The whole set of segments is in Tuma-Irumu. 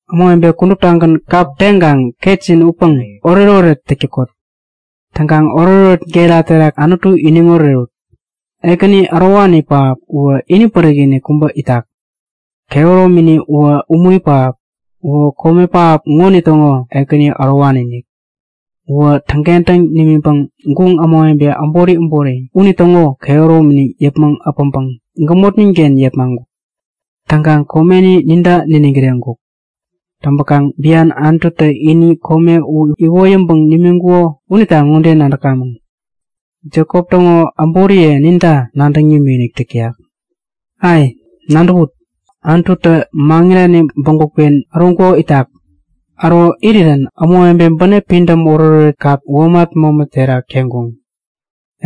Ämawebe kuduptagän kap teŋkaŋ ketjin utpäŋ oretoret täk täkot! Täŋkaŋ oretoret gera terak Anutu iniŋ orerut! Ekäni ärowani pähap uwä ini pärik-inik kubä itak. Kehäromini uwä umuri pähap. Uwä kome pähap ŋonitäŋo Ekäni ärowani-inik. Uwä täŋkentäŋ nimiŋpäŋ guŋ ämawebe äbori äbori unitäŋo kehäromini yäpmäŋ äpäŋpäŋ gämotninken yepmaŋkuk. Täŋkaŋ komeni ninta niniŋ kireŋkuk. Täŋpäkaŋ bian Anututä ini kome u iwoyäŋpäŋ nimiŋkuko unita ŋode nadäkamäŋ; Jekop täŋo äboriye ninta nadäŋ nimikinik täk täyak. Ai, nadäwut! Anututä maŋirani bägupken äroŋkuko itak. Äro irirän ämawebetä bänep pidäm oretoret kap womat mämä terak teŋkuŋ.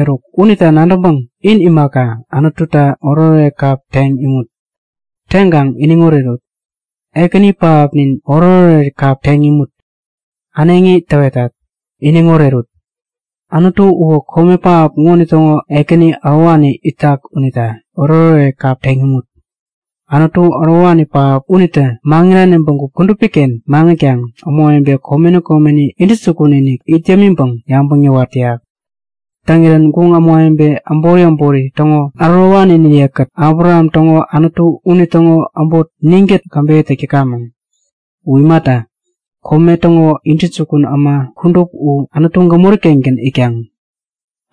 Eruk! Unita nadäŋpäŋ in imaka, Anututa oretoret kap teŋ imut! Teŋkaŋ iniŋ orerut! Ekäni pähapnin oretoret kap teŋ imut. Äneŋi täwetat; Iniŋ orerut! Anutu uwä kome pähap ŋonitäŋo Ekäni ärowani itak unita oretoret kap teŋ imut! Anutu ärowani pähap unitä maŋirani bägup kudupiken maŋitkaŋ ämawebe komeni komeni intäjukun-inik it yämiŋpäŋ yabäŋ yäwat täyak. Täŋirän guŋ ämawebe äbori äbori täŋo ärowaniniyekät Abraham täŋo Anutu unitäŋo äbot ninkät käbeyä täk täkamäŋ. U imata, kome täŋo intäjukun äma kudup u Anutu gämori-kengän itkaŋ.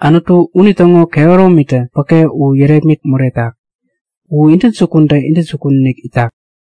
Anutu unitäŋo kehärominitä päke u yärepmit moretak! U intäjukuntä intäjuninik itak.